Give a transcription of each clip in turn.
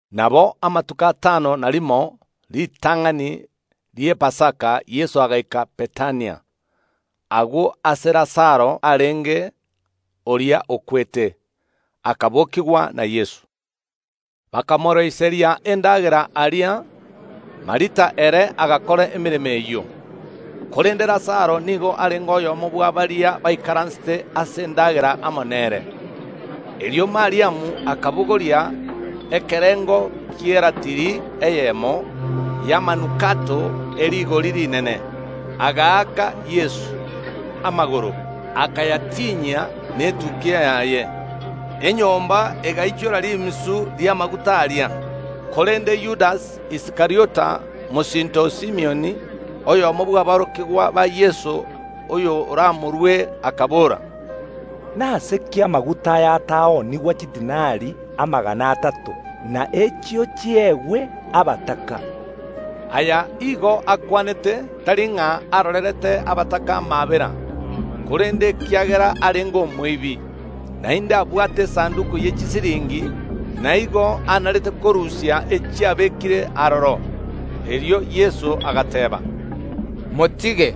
Nabo amatuko atano na rimo ritang’ani ri’Epasaka Yeso agaika Bethania, agwo aase Lazaro arenge, oria okwete, akabokigwa na Yeso. Bakamoroiseria endagera aria. Martha ere agakora emeremo eyio, korende Lazaro nigo arenge oyomo bwa baria baikaransete ase endagera amo nere. Erio Mariamu akabogoria ekerengo ki’eratili eyemo y’amanukato e rigori rinene, agaaka Yeso amagoro, akayatinyia netukia yaye; enyomba egaichora rimisu ri’amaguta aria. Korende Yudasi Iskariota mosinto o Simioni, oyomo bw’aborokigwa ba Yeso oyoramorue, akabora, “Nase ki amaguta aya ataoonigwa chidinari amagana atato, na echio chiegwe abataka?” Aya igo akwanete, tari ng’a arorerete abataka amaabera, korende nekiagera arenge omoibi, naende abwate esanduki ye chibesa, na igo anarete korusia echiabekire aroro. Erio Yeso agateeba, “Motige,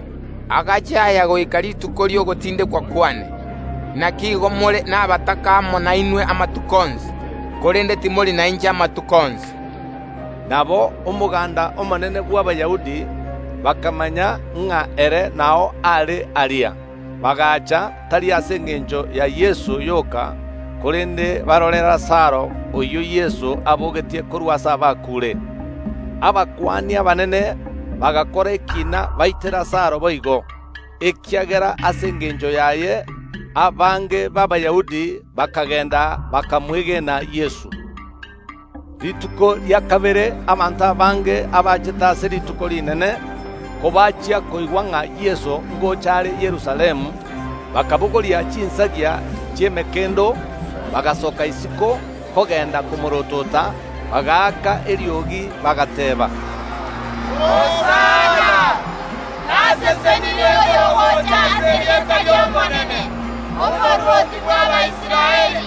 agache aya goika rituko ri’ogotindekwa kwane. Naki igo more nabataka amo nainwe amatuko onsi, korende timori nainche amatuko onsi.” Nabo omoganda omonene bw’Abayahudi bakamanya ng’a ere nao are aria; bagacha, tari ase engencho ya Yeso yoka, korende barore Lazaro, oyio Yeso abogetie korwa ase abakuure. Abakuani abanene bagakora ekiina baite Lazaro boigo, ekiagera ase engencho yaye abange b’Abayahudi bakagenda bakamwegena Yeso. Rituko rikobwatia abanto abange abachete ase Rituko Rinene, kobachia koigwa ng’a Yeso ngocha are Yerusalemu, bakabogoria chinsagia chi’emekendo, bagasoka isiko kogenda komoorotota, bagaaka eriogi, bagateeba, “Hosana! Nasesenirie oyogocha ase erieta ri’Omonene, Omorwoti bw’Abaisraeli.”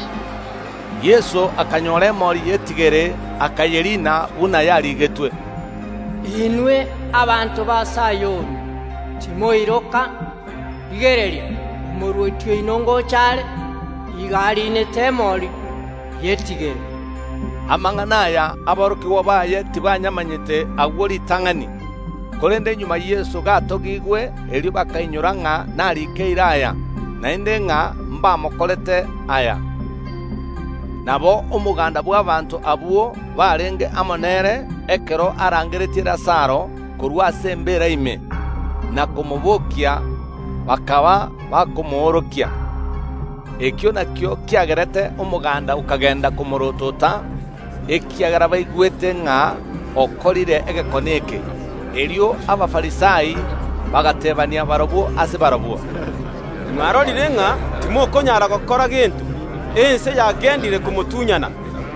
Yeso akanyora emori y’etigere, akayeriina, buna yarigetwe, “Inwe abanto ba Sayoni, timoiroka! Rigereria, Omorwoti oino ngocha are, igo ariinete emori y’etigere.” Amang’ana aya aborokigwa baye tibayamanyete agwo ritang’ani, korende magega Yeso gatogigwe, erio bakainyora ng’a narikeire aya, naende ng’a mbamokorere aya. Nabo omoganda bw’abaanto abwo barenge amo nere ekero arangeretie Lazaro korwa ase embeera ime, na komobokia, bakaba bakomoorokia. Ekio nakio kiagerete omoganda okagenda komoorotota, ekiagera baigwete ng’a okorire egekone eke. Erio Abafarisai bagateebania barabwo ase barabwo, “Mwarorire ng’a timokonyara gokora gento; ense yagendire komotunyana.”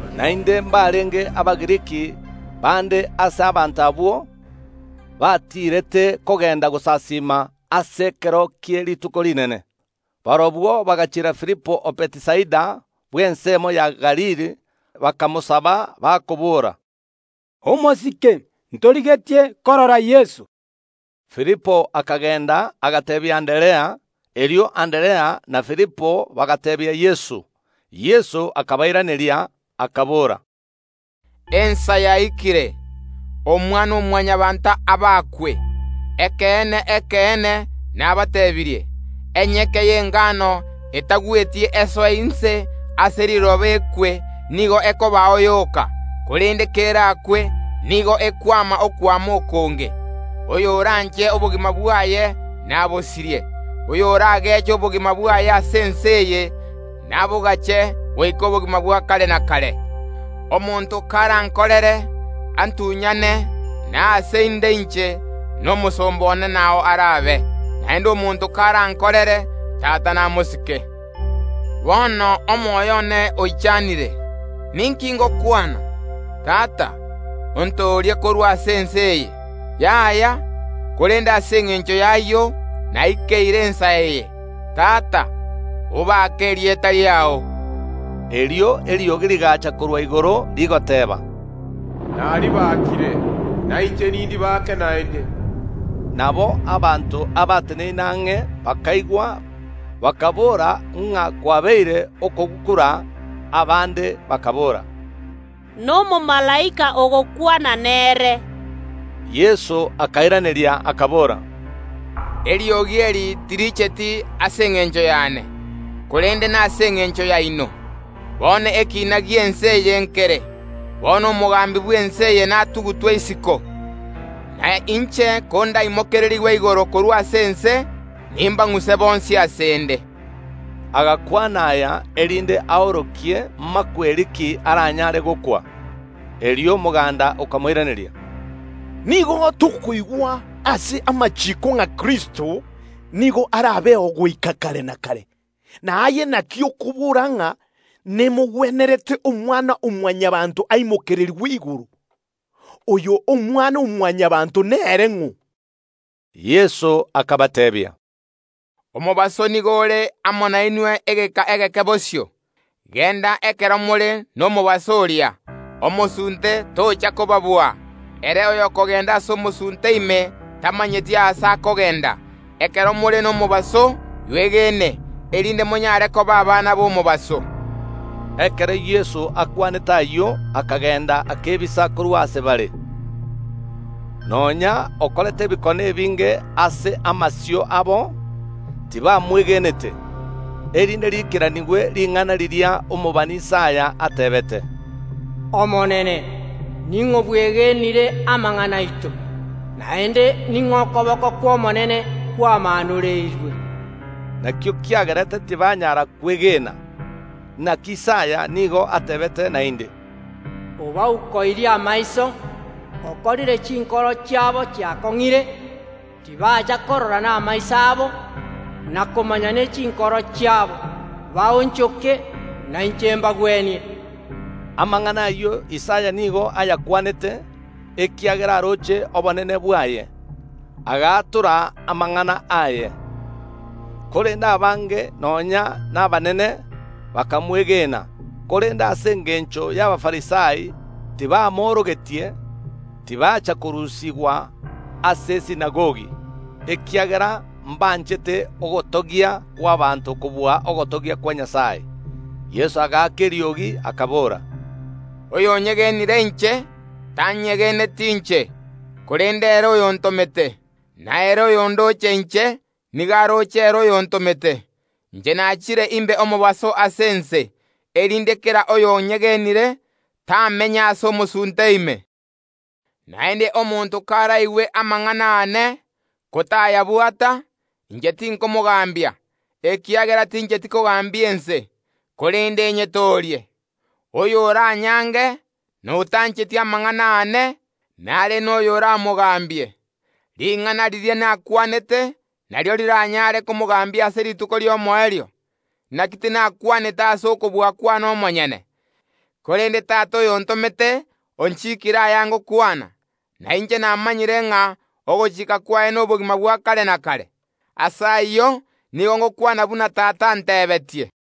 Naende mbarenge Abagiriki bande ase abanto abwo batiirete kogenda gosasiima ase ekero kie Rituko Rinene. Barabwo bagachiera Filipo o Bethisaida bw’ensemo ya Galili, bakamosaba, bakobora, “Omosike, ntorigetie korora Yeso.” Filipo akagenda, agateebia Anderea; erio Anderea na Filipo bagateebia Yeso. Yeso akabairaneria, akabora, “Ensa yaikire, Omwana‐o‐Mwanyabaanto abakwe. Ekeene, ekeene, nabateebirie; Enyeke y’engano etagweti esoe inse ase riroba ekwe, nigo ekobao yoka; korende kerakwe, nigo ekwama okwama okonge. Oyoranche obogima bwaye, nabosirie; oyorageche obogima bwaye ase ense eye, nabogache goika obogima bwa kare na kare. Omonto karankorere, antunyane; na aase inde inche, nomosomba one nao arabe; naende omonto karankorere, Tata namosike. “Bono omoyo one oichanire; ninki ngokwana? Tata, ontoorie korwa ase ense eye! Yaya, korende ase engencho y’ayio naikeire ensa eye. Tata, obake erieta riao!” Erio eriogi rigacha korwa igoro, rigateba, “Naribakire, na inche nindibake naende.” Nabo abanto abateneine ang’e bakaigwa, bakaboora ng’a kwabeire okogukura; abande bakaboora, “Nomomalaika ogokwana nere.” Yeso akairaneria, akabora, “Eriogi eri tiricheti ase engencho yane, korende nase engencho yaino. Bono ekiina gi’ense eye nkere; bono omogambi bw’ense eye natugutwe isiko. Na inche kondaimokererigwe igoro korwa ase ense, nimbang’use bonsi ase ’nde.” Agakwana aya, erinde aorokie imakweri ki aranyare gokwa. Erio omoganda okamoiraneria, “Nigo tokoigwa ase amachiiko ng’a Kristo nigo arabeo goika kare na kare, na aye naki okobora ng’a nemogwenerete Omwana‐o‐Mwanyabaanto aimokererigwe igoro? Oyo Omwana‐o‐Mwanyabaanto nere ng’o?” Yeso akabateebia, “Omobaso nigo ore amo nainwe egeka egeke bosio. Genda ekero more nomobaso oria, omosunte tocha kobabua; ere oyokogenda ase omosunte ime tamanyeti aase akogenda. Ekero more nomobaso yuegene, erinde monyare koba abana b’omobaso.” Ekero Yeso akwanete ayio akagenda akebisa korwa ase bare. Nonya okorete ebikone ebinge ase amasio abo, tibamwegenete, erinde riikeranigwe ring’ana riria omobani Isaya ateebete, “Omonene, ning’o bwegenire amang’ana aito? Naende ning’o okoboko kw’Omonene kwamaanoreirwe?” Nakio kiagerete tibanyara kwegena. Naki Isaya nigo ateebete naende, “Obaukoirie amaiso, okorire chinkoro chiabo chiakong’ire, tibacha korora namaiso abo, na komanya ne chinkoro chiabo, baonchoke na inche mbagwenie.” Amang’ana ayio Isaya nigo ayakwanete, ekiagera aroche obonene bwaye; agaatora amang’ana aye. Korende abange nonya nabanene bakamwegena, korende ase engencho y’Abafarisai tibamoorogetie, tibacha korusigwa ase esinagogi, ekiagera mbanchete ogotogia kw’abaanto kobua ogotogia kwa Nyasae. Yeso agaaka eriogi akabora, “Oyonyegenire inche, tanyegeneti inche omonyene, korende ere oyontomete. Na ere oyondoche inche nigo aroche ere oyontomete. Inche nachire imbe omobaso ase ense, erinde kera oyonyegenire, tamenya ase omosunte ime. Naende omonto karaigwe amang’ana aane, ko tayabwata, inche tinkomogambia, ekiagera tincheti kogambia ense, korende nyetoorie. Oyo oranyange na otancheti amang’ana aane, nare noyo oramogambie. Ring’ana riria nakwanete, nario riranyare komogambia ase rituko ri’omoerio. Naki tinakwanete ase okobua kwane omonyene, korende Tata oyontomete onchikiire aya ngokwana. Na inche namanyire ng’a ogochika kwaye nobogima bwa kare na kare. Ase ayio nigo ngokwana buna Tata antebetie.”